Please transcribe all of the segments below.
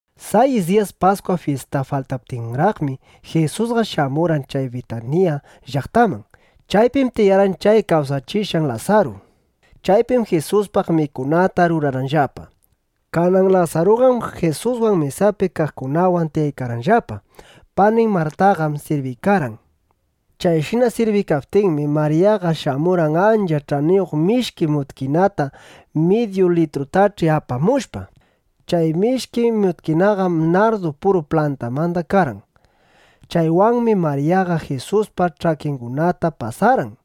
Sayis diyas Paskwa fyista faltaptinraqmi, Jisusqa shamurqan chay Bitanilla (Bitaniya) llaqtaman. Chaypim tiyarqan chay kawsachishqan Lasaru. Chaypim Jisuspaq mikunata rurarqanllapa. Kanan Lasaruqam Jisuswan mesapi kaqkunawan tiyaykarqanllapa. Panin Martaqam sirbiykarqan. Chayshina sirbiykaptinmi, Maryaqa shamurqan ancha ch'aniyuq mishki mutkinata midyu litrutach'i apamushpa. Chay mishki mutkinaqam nardu puru plantamanda karqan. Chaywanmi Maryaqa Jisuspa ch'akingunata pasarqan.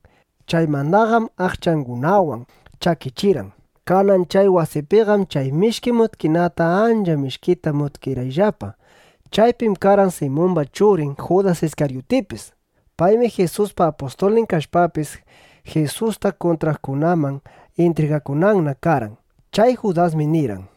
Chaymandaqam aqchangunawan chakichirqan. Kanan chay wasipiqam chay mishki mutkinata ancha mishkita mutkirqayllapa. Chaypim karqan Simumba churin Judas Iskaryutipis. Paymi Jisuspa apustulnin kashpapis, Jisusta kuntraqkunaman intrigakunanna karqan. Chay Judasmi nirqan: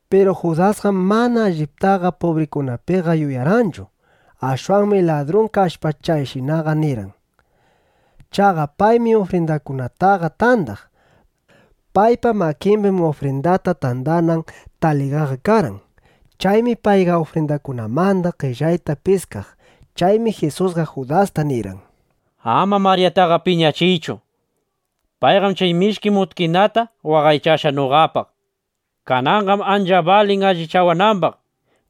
Piru Judasqam mana alliptaqa pubrikunapiqa yuyarqanchu. Ashwanmi ladrun kashpa, chayshinaqa nirqan. Chaqa paymi ufrindakunataqa tandaq. Paypa makimbim ufrindata tandanan taligaqa karqan. Chaymi payqa ufrindakunamanda qellayta piskaq. Chaymi Jisusqa Judasta nirqan: —Ama Maryataqa piñachiychu. Payqam chay mishki mutkinata waqaychashqa noqapaq. Kananqam ancha balin allichawanambaq,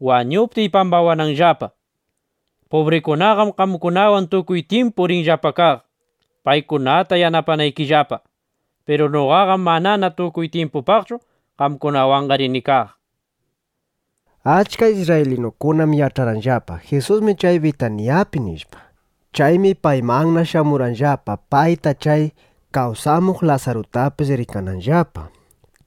wañuptiy, pambawananllapa. Pubrikunaqam qamkunawan tukuy tyimpu rinllapa kaq, paykunata yanapanaykillapa. Piru noqaqam manana tukuy tyimpupaqchu qamkunawanqa rini kaq, nishpa. Achka isrraylinukunam yach'arqanllapa: Jisusmi chay Bitanillapi (Bitaniyapi), nishpa. Chaymi paymanna shamurqanllapa, payta chay kawsamuq Lasarutapis rikananllapa.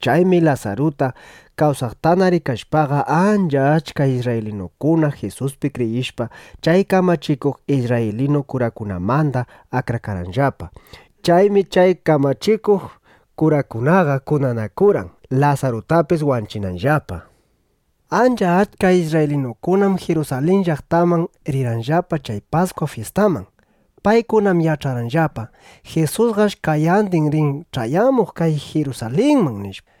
Chaymi Lasaruta kawsaqtana rikashpaqa, ancha achka isrraylinukuna Jisuspi kriyishpa, chay kamachikuq isrraylinu kurakunamanda akrakarqanllapa. Chaymi chay kamachikuq kurakunaqa kunanakurqan, Lasarutapis wanchinanllapa. Ancha achka isrraylinukunam Jirusalin llaqtaman rirqanllapa chay Paskwa fyistaman. Paykunam yach'arqanllapa: Jisusqash qayandin rin ch'ayamuq kay Jirusalinman, nishpa.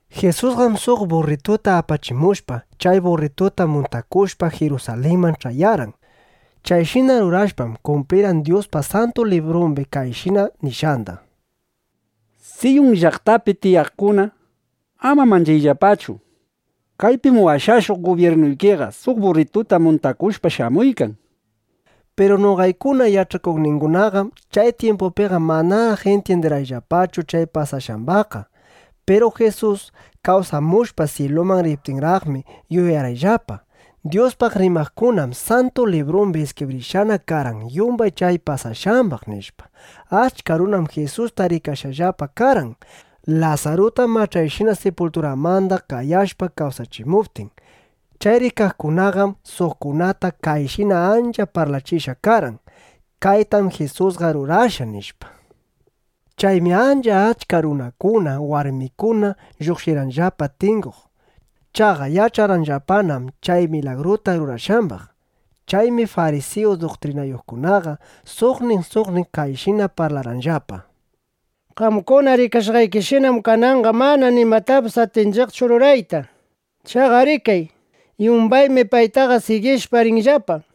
Jisusqam suq burrituta apachimushpa, chay burrituta muntakushpa, Jirusalinman ch'ayarqan. Chayshina rurashpam, kumplirqan Dyuspa Santu Librumbi kayshina nishqanda: Siyun llaqtapi tiyaqkuna, ama manchayllapachu. Kaypim washashuq gubyirnuykiqa suq burrituta muntakushpa, shamuykan, nishpa. Piru noqaykuna yach'akuqningunaqam chay tyimpupiqa manaraq intyindirqayllapachu chay pasashqambaqqa. Piru Jisus kawsamushpa, syiluman riptinraqmi, yuyarqayllapa: Dyuspaq rimaqkunam Santu Librumbi iskibrishqana karqan yumbay chay pasashqambaq, nishpa. Achka runam Jisusta rikashqallapa karqan, Lasaruta mach'ayshina sipulturamanda qayashpa kawsachimuptin. Chay rikaqkunaqam suqkunata kayshina ancha parlachishqa karqan: —Kaytam Jisusqa rurashqa, nishpa. Chaymi ancha achka runakuna, warmikuna lluqshirqanllapa tinguq. Chaqa yach'arqanllapanam chay milagruta rurashqambaq. Chaymi farisiyu duktrinayuqkunaqa suqnin suqnin kayshina parlarqanllapa: —Qamkuna rikashqaykishinam, kananqa manana nimatapis atinchiqchu rurayta. Chaqa rikay, yumbaymi payta sigishpa, rinllapa, nishpa.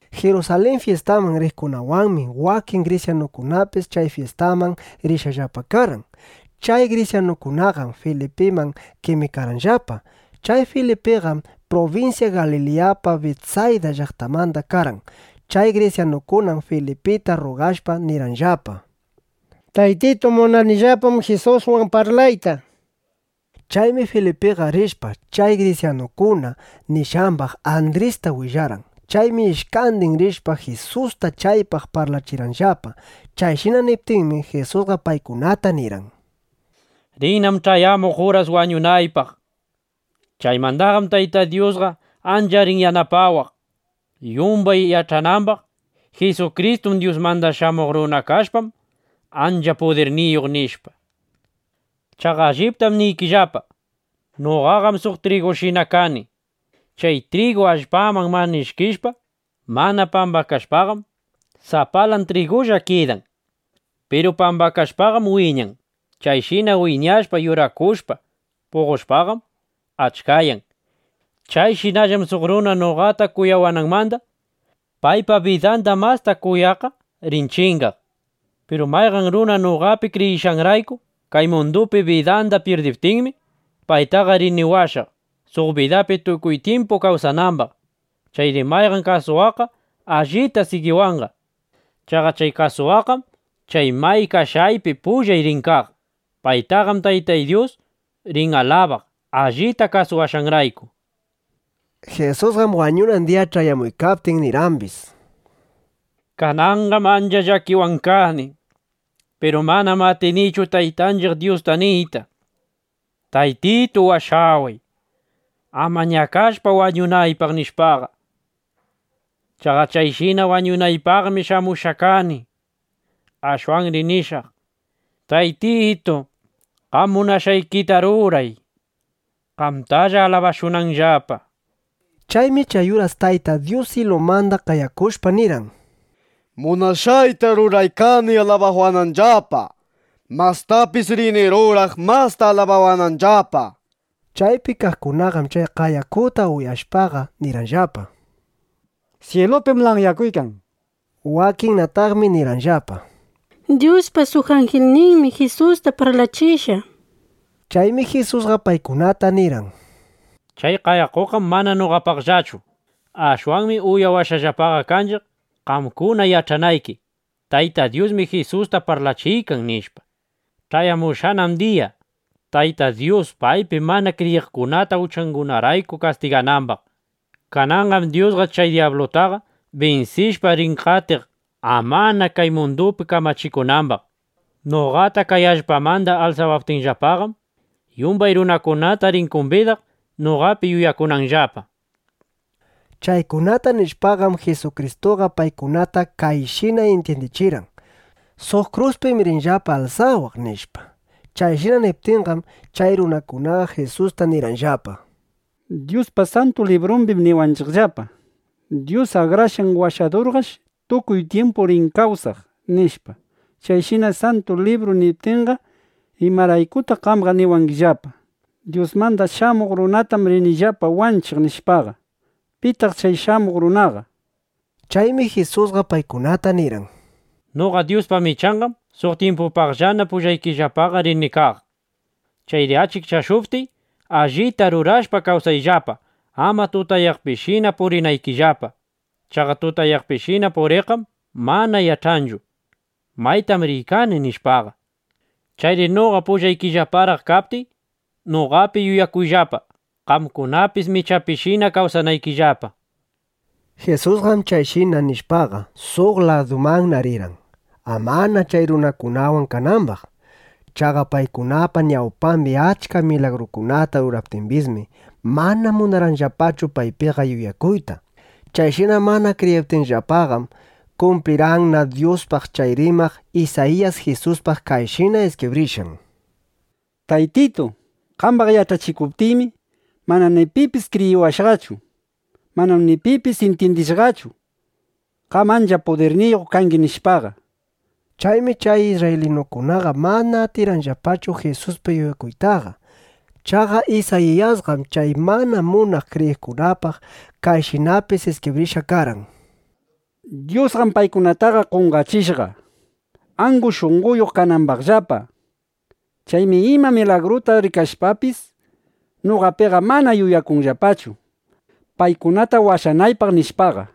Jirusalin fyistaman riqkunawanmi wakin grisyanukunapis chay fyistaman rishqallapa karqan. Chay grisyanukunaqam Filipiman qemikarqanllapa. Chay Filipiqam prubinsya Galiliyapa Bitsayda llaqtanmanda karqan. Chay grisyanukunam Filipita rrugashpa, nirqanllapa: —Taytitu, munanillapam Jisuswan parlayta, nishpa. Chaymi Filipiqa rishpa, chay grisyanukuna nishqambaq Andrista willarqan. Chaymi ishkandin rishpa, Jisusta chaypaq parlachirqanllapa. Chayshina niptinmi, Jisusqa paykunata nirqan: —Rinnam ch'ayamuq uras wañunaypaq. Chaymandaqam Taytay Dyusqa ancha rin yanapawaq, yumbay yach'anambaq: Jisukristu Dyusmanda Shamuq Runa kashpam, ancha pudirniyuq, nishpa. Chaqa alliptam niykillapa, noqaqam suq trigushina kani. Chay trigu allpaman mana ishkishpa, mana pambakashpaqam, sapalan trigulla kidan. Piru pambakashpaqam wiñan. Chayshina wiñashpa, yurakushpa, puqoshpaqam, achkayan. Chayshinallam suq runa noqata kuyawananmanda paypa bidanda masta kuyaqqa rin chingaq. Piru mayqan runa noqapi kriyishqanrayku kay mundupi bidanda pyirdiptinmi, paytaqa rini washaq, suq bidapi tukuy tyimpu kawsanambaq. Chayri mayqan kasuwaqqa allita sigiwanqa. Chaqa chay kasuwaqqam chay may kashqaypi pullay rin kaq. Paytaqam Taytay Dyus rin alabaq, allita kasuwashqanrayku, nishpa. (Jisusqam wañunan diya ch'ayamuykaptin, nirqambis:) —Kananqam ancha llakiwan kani. Piru manam atinichu Taytanchiq Dyusta niyta: “Taytitu washaway, ama ñakashpa wañunaypaq”, nishpaqa. Chaqa chayshina wañunaypaqmi shamushqaqa kani. Ashwanri nishaq: “Taytitu, qam munashqaykita ruray, qamtalla alabashunanllapa”, nishpa. Chaymi chay uras Tayta Dyus syilumanda qayakushpa, nirqan: —Munashqayta ruraykani alabawananllapa. Mastapis rini ruraq, masta alabawananllapa, nishpa. Chaypi kaqkunaqam chay qayakuta uyashpaqa, nirqanllapa: —Syilupim lanyakuykan, nishpa. Wakinnataqmi nirqanllapa: —Dyuspa suq anjilninmi Jisusta parlachishqa, nishpa. Chaymi Jisusqa paykunata nirqan: —Chay qayakuqam mana noqapaqllachu. Ashwanmi uyashqallapaqa kanchiq, qamkuna yach'anayki: Tayta Dyusmi Jisusta parlachiykan, nishpa. Ch'ayamushqanam diya, Tayta Dyus paypi mana kriyiqkunata uchangunarayku kastiganambaq. Kananqam Dyusqa chay dyablutaqa binsishpa, rin qatiq, amana kay mundupi kamachikunambaq. Noqata kay allpamanda alsawaptinllapaqam, yumbay runakunata rini kumbidaq, noqapi yuyakunanllapa. Chaykunata nishpaqam, Jisukristuqa paykunata kayshina intyindichirqan: Suq kruspim rinllapa alsawaq, nishpa. Chayshina niptinqam, chay runakunaqa Jisusta nirqanllapa: —Dyuspa Santu Librumbim niwanchiqllapa: “Dyus Akrashqan Washadurqash tukuy tyimpu rin kawsaq”, nishpa. Chayshina Santu Libru niptinqa, ¿imaraykutaq qamqa niwangillapa: “Dyusmanda Shamuq Runatam rinllapa wanchiq”, nishpaqa? ¿Pitaq chay shamuq runaqa? nishpa. Chaymi Jisusqa paykunata nirqan: —Noqa Dyuspa michanqam suq tyimpupaqllana pullaykillapaqa rini kaq. Chayri achikchashuptiy, allita rurashpa kawsayllapa, ama tutayaqpishina purinaykillapa. Chaqa tutayaqpishina puriqqam mana yach'anchu: Maytam riykani, nishpaqa. Chayri noqa pullaykillaparaq kaptiy, noqapi yuyakuyllapa, qamkunapis michapishina kawsanaykillapa, nishpa. Jisusqam chayshina nishpaqa, suq ladumanna rirqan, amana chay runakunawan kanambaq. Chaqa paykunapa ñawpambi achka milagrukunata ruraptimbismi, mana munarqanllapachu paypiqa yuyakuyta. Chayshina mana kriyiptinllapaqam, kumplirqanna Dyuspaq chay rimaq Isayiyas Jisuspaq kayshina iskibrishqan: Taytitu, qambaq yach'achikuptiymi, mana pipis kriyiwashqachu. Manam ni pipis intyindishqachu: Qam ancha pudirniyuq kangi, nishpaqa. Chaymi chay isrraylinukunaqa mana atirqanllapachu Jisuspi yuyakuytaqa. Chaqa Isayiyasqam chay mana munaq kriyiqkunapaq kayshinapis iskibrishqa karqan: Dyusqam paykunataqa qonqachishqa, angu shunqoyuq kanambaqllapa. Chaymi ima milagruta rikashpapis, noqapiqa mana yuyakunllapachu, paykunata washanaypaq, nishpaqa.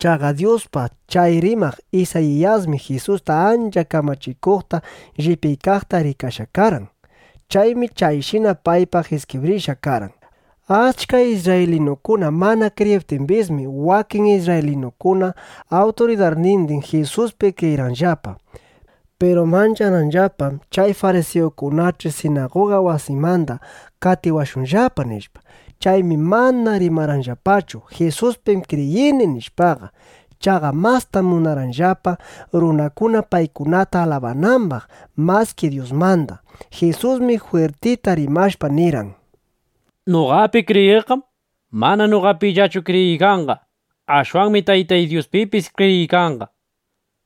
Chaqa Dyuspa chay rimaq Isayiyasmi Jisusta ancha kamachikuqta, llipyaykaqta rikashqa karqan. Chaymi chayshina paypaq iskibrishqa karqan. Achka isrraylinukuna mana kriyiptimbismi, wakin isrraylinukuna awturidarnindin Jisuspi kriyirqanllapa. Piru mancharqanllapam: Chay farisiyukunach'i sinaguga wasimanda qatiwashunllapa, nishpa. Chaymi mana rimarqanllapachu: “Jisuspim kriyini”, nishpaqa. Chaqa mastam munarqanllapa, runakuna paykunata alabanambaq maski Dyusmanda. Jisusmi jwirtita rimashpa, nirqan: —Noqapi kriyiqqam mana noqapillachu kriyiykanqa. Ashwanmi Taytay Dyuspipis kriyiykanqa.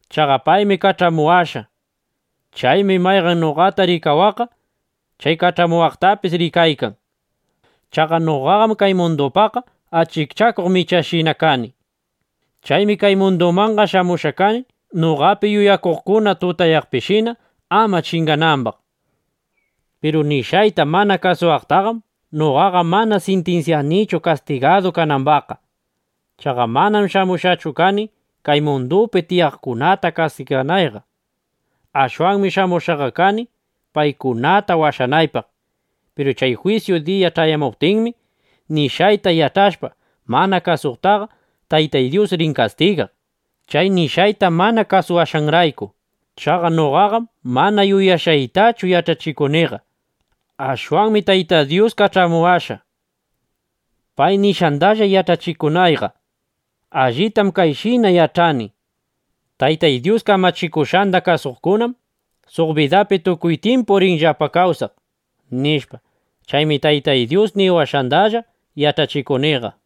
Chaqa paymi kach'amuwashqa. Chaymi mayqan noqata rikawaqqa chay kach'amuwaqtapis rikaykan. Chaqa noqaqam kay mundupaqqa achikchakuq michanshina kani. Chaymi kay mundumanqa shamushqa kani, noqapi yuyakuqkuna tutayaqpishina ama chinganambaq. Piru nishqayta mana kasuwaqtaqam noqaqa mana sintinsyanichu, kastigadu kanambaqqa. Chaqa manam shamushqachu kani, kay mundupi tiyaqkunata kastiganayqa. Ashwanmi shamushqaqa kani, paykunata washanaypaq. Piru chay jwisyu diya ch'ayamuptinmi, nishqayta yach'ashpa mana kasuqtaqa Taytay Dyus rin kastigaq, chay nishqayta mana kasuwashqanrayku. Chaqa noqaqam mana yuyashqaytachu yach'achikuniqa. Ashwanmi Tayta Dyus kach'amuwashqa, pay nishqandalla yach'achikunayqa. Allitam kayshina yach'ani: Taytay Dyus kamachikushqanda kasuqkunam suq bidapi tukuy tyimpu rinllapa kawsaq, nishpa. Chaymi Taytay Dyus niwashqandalla yach'achikuniqa.